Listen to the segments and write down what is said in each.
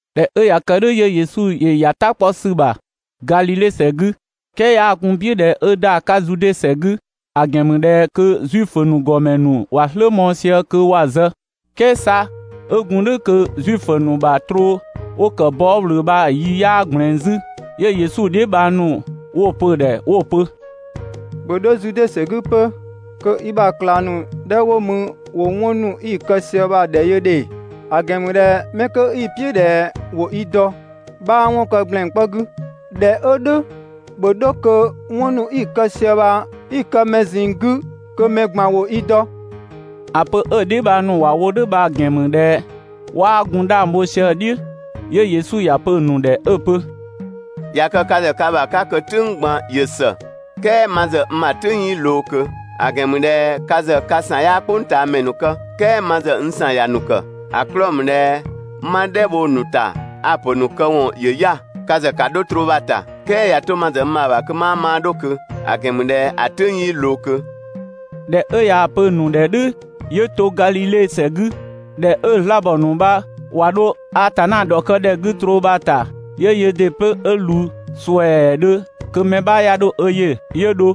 ꞊Dhɛ 'ö ꞊ya kë "dhʋ̈ 'yö Yesu ‑yö ‑ya "ta 'kpɔ ‑sü ‑bha Gadhidhe ‑sɛ 'gü, "kɛɛ 'yaa gun‑ "piʋ̈ ꞊dhɛ 'ö ‑da 'ka Zude ‑sɛ 'gü, ‑a ‑gɛn ‑mü ꞊dhɛ kö Zuifö ‑nu ‑gɔmɛ ‑nu ‑wa "slë mɔɔ‑ sië kö ‑wa zë. "Kɛɛ 'sa 'ö gun "dhʋ̈ kö Zuifö ‑nu bha troo 'wo‑ ‑kë bɔɔ" ꞊wlöö bha‑ yi 'yaa ꞊gblɛɛn 'zü. 'Yö Yesu dheebhang ‑nu 'wo‑ pö‑ ‑dhɛ 'wo‑ pö: «‑Bhö 'dho Zude ‑sɛ 'gü 'pö kö i ‑bha ꞊klang ‑nu 'dhɛ 'wo mü ‑wo 'wɔn ‑nu 'i‑ kë sië ya‑ ‑dhɛ yö ‑dhe; ‑a ‑gɛn ‑mü ꞊dhɛ 'mɛ 'kö 'i‑ "piʋ̈ ꞊dhɛ ‑wo i dɔ, 'bhaa 'wɔn kë ‑gblɛn 'kpɔ 'gü. ꞊Dhɛ 'ö "dhʋ̈ ‑bhö 'dho kö 'wɔn ‑nu 'i‑ kë sië bha 'i‑ kë mɛ ꞊zinng 'gü kö mɛ ꞊gban ‑wo i dɔ.» ‑A pö 'ö‑ dheebhang ‑nu ‑wa wo "dhʋ̈ bha‑ ‑gɛn ‑mü ꞊dhɛ 'waa gun 'dhang bho sië‑ "dhiʋ̈. 'Yö Yesu ‑ya pö‑ ‑nu ‑dhɛ 'ö‑ pö: «꞊Ya kë ka ‑zë ka ‑bha 'ka kö "tʋ̈ng ꞊gban ‑yö ‑së, "kɛɛ ma ‑zë n ‑bha "tʋ̈ng 'yii ꞊loo ꞊kö.» ‑A ‑gɛn ‑mü ꞊dhɛ ka ‑zë ka ‑san 'yaa "kpʋngtaamɛ ‑nu kë, "kɛɛ ma ‑zë n ‑san ‑ya ‑nu ‑kë, ‑a 'klɔɔ‑ ‑mü ꞊dhɛ 'ma "dhɛ bho‑ ‑nu ‑ta, a‑ pö‑ ‑nu këwɔn ‑yö 'ya‑. Ka ‑zë ‑ka 'dho troo bha‑ ‑ta, "kɛɛ ꞊ya 'to ma ‑zë n ‑bha ‑bha kö 'maa maa 'dho ꞊kö, ‑a ‑gɛn ‑mü ꞊dhɛ ‑a "tʋ̈ng 'yii ꞊loo ꞊kö.» ꞊Dhɛ 'ö ꞊yaa‑ pö‑ ‑nu ‑dhɛ "dhʋ̈ 'yö to Gadhidhe ‑sɛ 'gü. ꞊Dhɛ 'ö‑ 'zlaabɔ ‑nu bha ꞊wa 'dho Atanna ‑dhɔkë ‑dhɛ 'gü troo bha‑ ‑ta, 'yö yöö ‑dɩ 'pö 'ö ꞊wlü ‑suɛɛdhö kö mɛ 'bha 'ya 'dho ö yö, 'yö dho.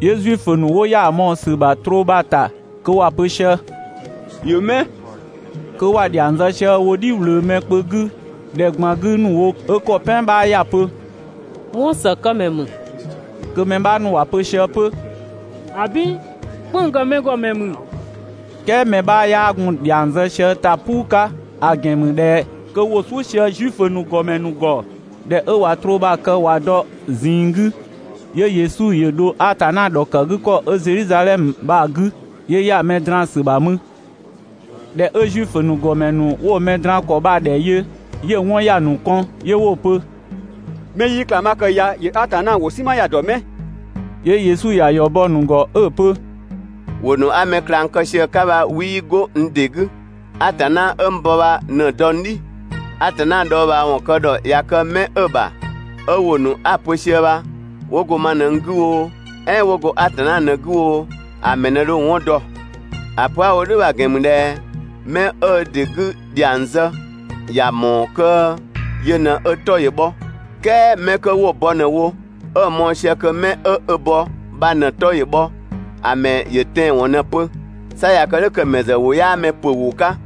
'Yö Zuifö ‑nu 'wo ‑ya mɔɔ‑ ‑sü ‑bha troo bha‑ ‑ta kö ‑wa pö sië: «‑Yö 'mɛ?» Kö ‑wa ‑dhiang zë sië wo "dhi ꞊wlöö mɛ kpö 'gü ‑dhɛ ꞊gban 'gü ‑nu wo 'ö ‑kɔ "pɛan 'bha ꞊ya pö: «'Wɔnsëkëmɛ ‑mü». Kö mɛ 'bha ‑nu ‑wa pö sië 'pö: «‑Abin, "kpënng‑ ‑kë mɛ ‑gɔ ‑mɛ ‑mü.» "Kɛɛ mɛ 'bha 'yaa gun‑ ‑dhiang zë sië ö ‑ta "puu 'ka, ‑a ‑gɛn ‑mü ꞊dhɛ kö ‑wo "suʋ̈ sië Zuifö ‑nu ‑gɔmɛ ‑nu ‑gɔ. ꞊Dhɛ 'ö ꞊wa troo bha‑ kë 'ö ꞊wa dɔ‑ ꞊zinng 'gü, 'yö Yesu ‑yö dho Atanna ‑dhɔkëgükɔ 'ö Zedhizadhɛmö bha‑ 'gü, 'yö ‑ya mɛ draan‑ ‑sü ‑bha mü. ꞊Dhɛ 'ö Zuifö ‑nu ‑gɔmɛ ‑nu 'wo‑ mɛ draan‑ ‑kɔ bha‑ ‑dhɛ yö, 'yö‑ 'wɔn ‑ya ‑nu kɔn, 'yö 'wo‑ pö: «Mɛ 'ö 'yii ꞊klang 'bha kë ya ‑yö Atanna ‑wʋ "sinma ya‑ ‑dɔ 'mɛ?» 'Yö Yesu ꞊ya ‑yɔ bɔ‑ ‑nu ‑gɔ 'ö‑ pö: «‑Wʋ ‑nu 'a mɛ ꞊klang kë sië‑ 'ka bha 'wii 'go n ‑dɩ 'gü, Atanna 'ö n bɔ bha ꞊në‑ dɔ n "dhi!» Atanna dhɔɔbhaawɔn kë ‑dhɔ ꞊ya kë 'mɛ 'ö‑ ‑bha, 'ö ‑wʋ ‑nu 'a‑ pö sië bha 'wo go ma ꞊në n 'gü oo, "ɛɛn 'wo go Atanna ꞊në 'gü oo, ‑a ‑mɛ ꞊në dho‑ 'wɔn dɔ. ‑A pö 'a‑ wo "dhʋ̈ bha‑ ‑gɛn ‑mü ꞊dhɛ 'mɛ 'ö ö ‑dɩ 'gü ‑dhiang zë, ‑ya ‑mɔɔ kö yö ꞊në 'ö 'tɔ ‑yö bhɔ, "kɛɛ 'mɛ 'kö 'wo‑ bɔ ꞊në wo 'ö‑ mɔɔ‑ sië kö 'mɛ 'ö ö bɔ bha ꞊në‑ 'tɔ ‑yö bhɔ, ‑a ‑mɛ ‑yö tɛanwɔn ꞊në pö, 'sa ꞊ya kë "dhʋ̈ kö ‑a ‑mɛ ‑zë ‑wʋ 'yaa mɛ ‑pö ‑wʋ 'ka.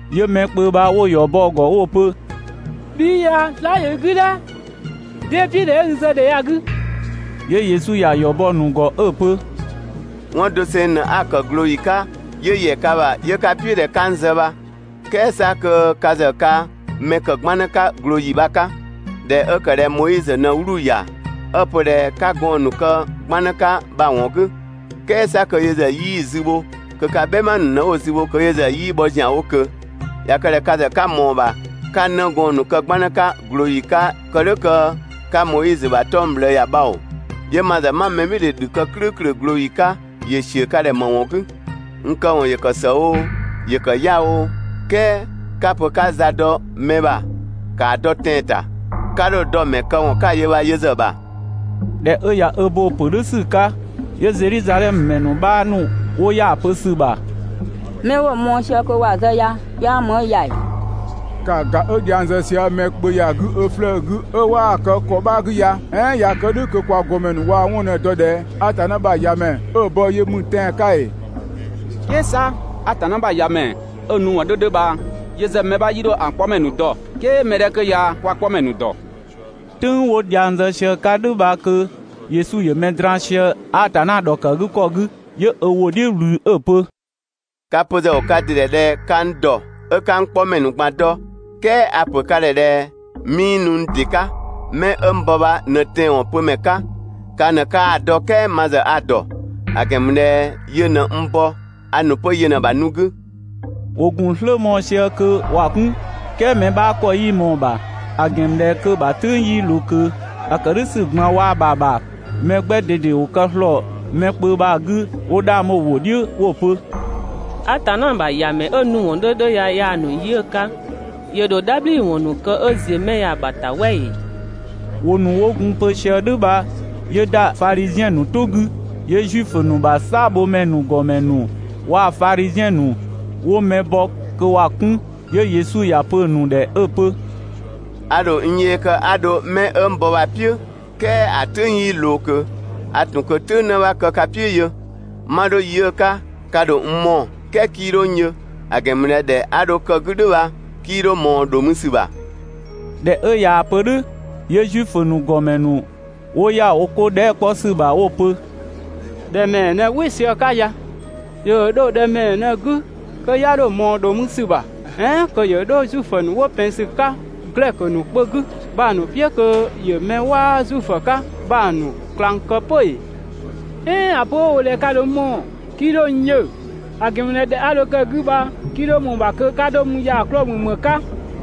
'Yö mɛ kpö bha 'wo‑ ‑yɔ bɔ‑ ‑gɔ 'wo‑ pö: «Bhi 'i ya slaa" ‑yö i 'gü "dhɛ! 'Dee "piʋ̈ ꞊dhɛ 'ö i zë ‑dhɛ ya‑ 'gü?» 'Yö Yesu ‑ya ‑yɔ bɔ‑ ‑nu ‑gɔ 'ö‑ pö: «'Wɔn doseng ꞊në 'a‑ kë (꞊glooyi 'ka), 'yö ‑yɛ ka ‑bha ('yö 'ka‑ "piʋ̈ ꞊dhɛ 'ka n zë bha), "kɛɛ 'sa kö ka ‑zë ka mɛ ‑kë 'gbannë 'ka ꞊glooyi bha‑ 'ka, ꞊dhɛ 'ö ‑kë ꞊dhɛ Moizö ꞊në 'wluu‑ ‑ya, 'ö‑ pö ꞊dhɛ 'ka gɔɔn‑ ‑nu kë 'gbannë 'ka bha‑ ‑wɔn 'gü, "kɛɛ 'sa kö yö ‑zë 'yii‑ zü bho, kö ka "bhɛma ‑nu ꞊në 'wo‑ zü bho (kö yö ‑zë 'yii bhɔ ‑zianwo ꞊kö). ꞊Ya kë ꞊dhɛ ka ‑zë 'ka ꞊mɔɔ‑ ‑bha 'ka 'nëgɔɔn ‑nu kë 'gbannë 'ka ꞊glooyi 'ka kë "dhʋ̈ kö 'ka Moizö ‑bha 'tɔng‑ ꞊bhlëë ‑ya bha oo, 'yö ma ‑zë 'ma mɛbhɩɩdhe ‑dhü kë "klʋ̈ʋ̈klʋ̈ ꞊glooyi 'ka, ‑yö ‑siö ka ‑dhɛ ‑më ‑wɔn 'gü? N këwɔn ‑yö ‑kë ‑së oo, ‑yö ‑kë 'ya‑ oo, "kɛɛ 'ka‑ pö 'ka za dɔ mɛ ‑bha ‑kaa dɔ tɛan‑ ‑ta. 'Ka 'dho‑ dɔ‑ ‑mɛ këwɔn 'ka‑ yö bha yö ‑zë ‑bha.» ꞊Dhɛ ꞊ya ö bo‑ pö "dhʋ̈ ‑sü 'ka, 'yö Zedhizadhɛmö ‑mɛ ‑nu 'bha ‑nu 'wo ‑ya pö ‑sü ‑bha: «'Mɛ 'wo‑ mɔɔ‑ sië kö ‑wa zë ya 'yaa ‑mü 'ö ya ‑ee?» ‑Kaa ‑ga 'ö dhiang zë sië mɛ kpö ya‑ 'gü ö 'flëë‑ 'gü 'ö 'waa‑ kë ‑kɔ 'bha‑ 'gü ya! "Ɛɛn ꞊ya kë "dhʋ̈ kö kwa ‑gɔmɛ ‑nu ꞊waa‑ 'wɔn ꞊në dɔ ꞊dhɛ Atanna ‑bha ‑Yamɛ 'ö‑ bɔ yö ‑mü tɛan‑ 'ka ‑ee? "Kɛɛ 'sa Atanna ‑bha ‑Yamɛ 'ö‑ nu ‑wɔn 'dhö 'dhö bha yö ‑zë mɛ 'bha 'yii 'dho‑ 'kpɔmɛ ‑nu dɔ, "kɛɛ mɛ 'dhɛ 'kö ya kwa‑ 'kpɔmɛ ‑nu ‑dɔ.» "Tʋ̈ng 'wo dhiang zë sië‑ 'ka "dhʋ̈ bha kö Yesu ‑yö mɛ draan‑ sië Atanna ‑dhɔkëgükɔ 'gü. 'Yö ö ‑wʋ "dhiʋ̈ ꞊wlü 'ö‑ pö: «Ka‑ pö ‑zë ‑wo ka ‑dɩ ‑dhɛ ꞊dhɛ 'ka n ‑dɔ 'ö 'ka n 'kpɔmɛ ‑nu ꞊gban dɔ, "kɛɛ a‑ ‑pö ka ‑dhɛ ꞊dhɛ 'mii nu n ‑dɩ 'ka, 'mɛ 'ö n bɔ bha ꞊në tɛanwɔn pömɛ 'ka, ka ꞊në 'kaa‑ dɔ "kɛɛ ma ‑zë a‑ ‑dɔ, ‑a ‑gɛn ‑mü ꞊dhɛ yö ꞊në n bɔ, a ‑nu 'pö yö ꞊në‑ ‑bha nu 'gü.» ‑Wo ‑gun "slë mɔɔ‑ sië kö ‑wa 'kun, "kɛɛ mɛ 'bha ‑kɔ 'yii ꞊mɔɔ‑ ‑bha, ‑a ‑gɛn ‑mü ꞊dhɛ kö‑ ‑bha "tʋ̈ng 'yii ꞊loo ꞊kö. ‑A ‑kë "dhʋ̈ ‑sü ꞊gban waa‑ ‑bha ‑bha, mɛ 'gbɛ ꞊dede ‑wo kë ‑slɔɔ mɛ kpö bha‑ 'gü 'wo 'dhang bho‑ "dhiʋ̈ 'wo‑ pö: «Atanna ‑bha ‑Yamɛ 'ö‑ nu ‑wɔn 'dhö 'dhö ya yaa‑ ‑nu yi 'ö‑ 'ka, ‑yö ‑dho "dhabhliwɔn ‑nu kë 'ö ‑ziö 'mɛ ya‑ ‑bha ‑ta "wɛ ‑ee?» ‑Wʋ ‑nu 'wo gun‑ pö sië "dhʋ̈ bha 'yö ‑da Fadhiziɛn ‑nu "tʋ 'gü. 'Yö Zuifö ‑nu ‑bha "saabhomɛ ‑nu ‑gɔmɛ ‑nu waa‑ Fadhiziɛn ‑nu 'wo mɛ bɔ kö ‑wa 'kun. 'Yö Yesu ‑ya pö‑ ‑nu ‑dhɛ 'ö‑ pö: «A ‑dho n yee kë 'a dho 'mɛ 'ö n bɔ bha‑ "piʋ̈, "kɛɛ ‑a "tʋ̈ng 'yii ꞊loo ꞊kö, a ‑tun ꞊kö "tʋ̈ng ꞊në 'bha ‑kë ka "piʋ̈ yö. 'Ma 'dho yi 'ö‑ 'ka ka ‑dho n mɔɔ‑, "kɛɛ 'kii 'dho n yö, ‑a ‑gɛn ‑mü ꞊dhɛ ‑dhɛ 'a dho kë‑ 'gü "dhʋ̈ bha 'kii 'dho ꞊mɔɔ ‑dho mü ‑sü ‑bha.» ꞊Dhɛ 'ö ꞊yaa‑ pö "dhʋ̈, 'yö Zuifö ‑nu ‑gɔmɛ ‑nu 'wo ‑ya wo 'ko dhɛɛ" 'kpɔ ‑sü ‑bha 'wo‑ pö: «‑Dhɛ ‑mɛɛ ꞊në "wɩ sië 'ka ya? ‑Yö ‑dho 'dho ‑dhɛ ‑mɛɛ ꞊në‑ 'gü kö 'ya 'dho ꞊mɔɔ ‑dho mü ‑sü ‑bha? "Ɛɛn kö ‑yö 'dho Zuifö ‑nu 'wo ‑pɛn ‑sü 'ka Glɛkö ‑nu kpö 'gü bha‑ ‑nu "piʋ̈ kö ‑yö 'mɛ 'waa Zuifö 'ka bha‑ ‑nu ꞊klang kë 'pö ‑ee? "Ɛɛn ‑a pö 'ö‑ wo ꞊dhɛ ka ‑dho n mɔɔ‑, 'kii 'dho n yö, ‑a ‑gɛn ‑mü ꞊dhɛ ‑dhɛ 'a dho kë‑ 'gü bha 'kii 'dho ꞊mɔɔ‑ ‑bha kö 'ka 'dho mü ya‑ 'klɔɔ‑ ‑mü ‑më 'ka?»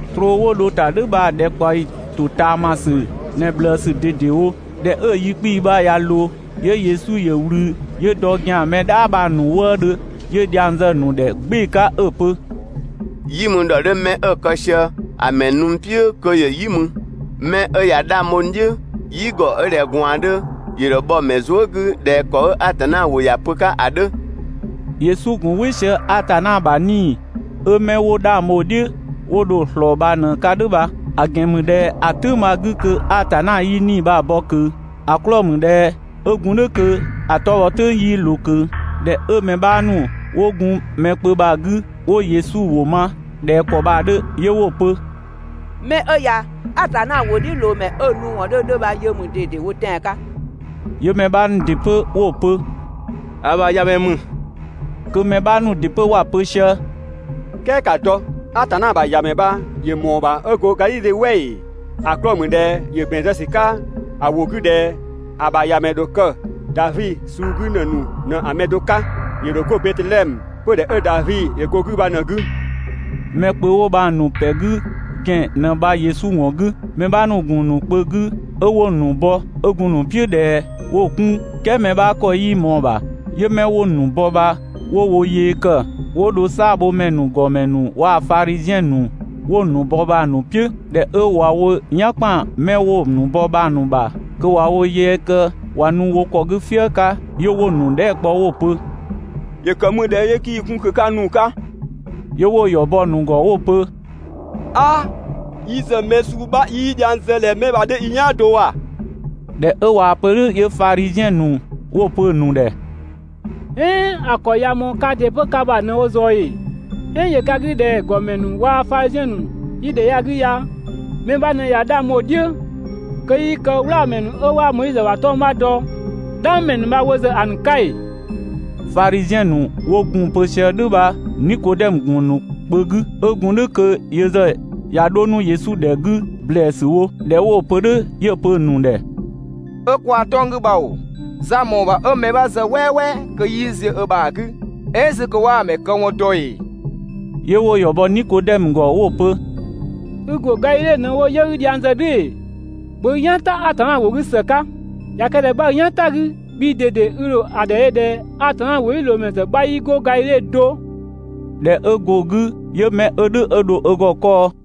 Troo 'wo dho‑ ‑ta "dhʋ̈ bha‑ ‑dhɛkpaɔyi ‑totaamasü ꞊në ꞊bhlëësü ꞊dedewo. ꞊Dhɛ 'ö‑ yi 'kpii‑ bha ꞊ya ꞊loo, 'yö Yesu ‑yö ꞊wlü 'yö dɔ ö ‑gɛan mɛ "dhaa bha‑ ‑nu wëëdhö 'yö dhiang zë‑ ‑nu ‑dhɛ "gbɩɩ‑ 'ka 'ö‑ pö: «"Yi mü ‑dhɔ 'dhö 'mɛ 'ö‑ kë sië ‑a ‑mɛ nu n "piʋ̈ kö ‑yö "yi mü! 'Mɛ 'ö ꞊ya 'dhang bho n "dhiʋ̈, "yigɔ 'ö ꞊dhɛ ꞊gwaan 'dhö ‑yö ‑dho bhɔ‑ ‑mɛ zuë" 'gü ꞊dhɛ ‑kɔ 'ö Atanna ‑wʋ ‑ya pö‑ 'ka ‑a 'dhö.» Yesu ‑gun "wɩ sië Atanna ‑bha 'Nii‑ 'ö 'mɛ 'wo dho 'dhang bho‑ "dhiʋ̈, 'wo dho‑ ꞊slɔɔ bha ꞊në‑ 'ka "dhʋ̈ bha, ‑a ‑gɛn ‑mü ꞊dhɛ ‑a "tʋ̈ng bha‑ 'gü kö Atanna 'yii 'Nii‑ bha‑ bɔ ꞊kö, ‑a 'klɔɔ‑ ‑mü ꞊dhɛ 'ö gun "dhʋ̈ kö ‑a 'tɔ bhɔ "tʋ̈ng 'yii ꞊loo ꞊kö. ꞊Dhɛ 'ö mɛ 'bha ‑nu 'wo gun mɛ kpö bha‑ 'gü 'wo Yesu ‑wʋ ma ꞊dhɛ ‑kɔ bha‑ 'dhö 'yö 'wo‑ pö: «'Mɛ 'ö ya Atanna ‑wʋdhiʋ̈loomɛ 'ö‑ ‑nu ‑wɔn 'dhö 'dhö bha yö ‑mü ꞊dedewo tɛan‑ 'ka!» 'Yö mɛ 'bha ‑nu ‑dɩ 'pö 'wo‑ pö: «‑A ‑bha ‑Yamɛ ‑mü!» Kö mɛ 'bha ‑nu ‑dɩ 'pö ‑wa pö sië: «"Kɛɛ ‑ka dɔ! Atanna ‑bha ‑Yamɛ bha ‑yö ‑mɔɔ ‑bha 'ö go Gadhidhe "wɛ ‑ee? ‑A 'klɔɔ‑ ‑mü ꞊dhɛ ‑yö ‑bɛn zë ‑sü 'ka ‑a ‑wʋ 'gü ꞊dhɛ ‑a ‑bha ‑Yamɛ bha‑ ‑dho kë Davi suu 'gü ‑në ‑nu ꞊në‑ mɛ do 'ka, ‑yö ‑dho go Betedhɛmö, 'pödhɛ 'ö Davi ‑yö go‑ 'gü bha ꞊në‑ 'gü!» Mɛ kpö 'wo bha‑ ‑nu ‑pɛ 'gü ‑gɛn ꞊në bha Yesu ‑wɔn 'gü. Mɛ 'bha ‑nu ‑gun ‑nu kpö 'gü 'ö ('wo‑ ‑nu bɔ, 'ö) gun‑ ‑nu "piʋ̈ ꞊dhɛ 'wo‑ 'kun "kɛɛ mɛ 'bha ‑kɔ 'yii ꞊mɔɔ‑ ‑bha. 'Yö 'mɛ 'wo‑ ‑nu bɔ bha 'wo wo yee ‑kë 'wo dho "saabhomɛ ‑nu ‑gɔmɛ waa‑ Fadhiziɛn ‑nu 'wo‑ ‑nu bɔ bha‑ ‑nu "piʋ̈. ꞊Dhɛ 'ö ꞊wa wo "yan ‑kpan 'mɛ 'wo‑ bɔ bha‑ ‑nu ‑bha kö ꞊wa wo yee kë ꞊wa nu wo ‑kɔ 'gü "fië 'ka, 'yö 'wo‑ ‑nu dhɛɛ" kpɔ 'wo‑ pö: «‑Yö ‑kë ‑mü ꞊dhɛ 'yö 'kii‑ 'kun kö 'ka nu‑ 'ka?» 'Yö 'wo ‑yɔ bɔ‑ ‑nu ‑gɔ 'wo‑ pö: «'Aa! Yi ‑zë mɛ suu 'bha 'yii dhiang zë ꞊dhɛ 'mɛ bha‑ 'dhö yi "yaan do ‑wa!» ꞊Dhɛ 'ö ꞊waa‑ pö "dhʋ̈ 'yö Fadhiziɛn ‑nu 'wo‑ pö‑ ‑nu ‑dhɛ: «"Ɛɛn ‑a ‑kɔ ꞊ya ꞊mɔɔ kaa ‑dɩ 'pö ka ‑bha ꞊në wo ꞊zɔɔ ‑ee? "Ɛɛn ‑yö ka 'gü ꞊dhɛ ‑gɔmɛ ‑nu waa‑ Fadhiziɛn ‑nu 'yi ‑dhɛ ya‑ 'gü ya mɛ 'bha ꞊në ꞊ya 'dhang bho‑ "dhiʋ̈, kö 'yii kë "wlaamɛ ‑nu 'ö 'waa Moizö ‑bha 'tɔng‑ 'bha dɔ, "dhangmɛ ‑nu bha wo ‑zë ‑a ‑nu 'ka ‑ee? Fadhiziɛn ‑nu 'wo gun‑ pö sië "dhʋ̈ bha Nikodɛmö ‑gun ‑nu kpö 'gü. 'Ö gun "dhʋ̈ kö yö ‑zë ꞊ya 'dho 'nu Yesu ‑dhɛ 'gü ‑blɛɛsü wo. ꞊Dhɛ 'wo‑ pö "dhʋ̈ 'yö‑ pö‑ ‑nu ‑dhɛ: «'Ö kwaa‑ 'tɔng‑ 'gü bha ‑oo, za‑ ‑mɔɔ ‑bha 'ö mɛ 'bha zë "wɛɛwɛɛ kö 'yii ziö ö ‑bha 'gü, "ɛɛn 'zü kö 'waa‑ ‑mɛ këwɔn dɔ ‑ee?» 'Yö 'wo‑ ‑yɔ bɔ Nikodɛmö ‑gɔ 'wo‑ pö: «i ‑go Gadhidhe ꞊në‑ wo 'pö 'yö 'i dhiang zë "dhʋ̈ ‑ee? ‑Bhö i "yan "ta Atanna ‑wʋ 'gü ‑së 'ka, ꞊ya kë ꞊dhɛ 'bha i "yan 'ta‑ 'gü, bhii ꞊dede i ‑dho ‑a ‑dhɛ yö ꞊dhɛ Atanna ‑wʋdhiʋ̈loomɛ ‑zë 'bha 'yii go Gadhidhe do.» [꞊Dhɛ 'ö go‑ 'gü 'yö mɛ 'ö "dhʋ̈ 'ö dho ö ‑gɔ 'kɔɔ.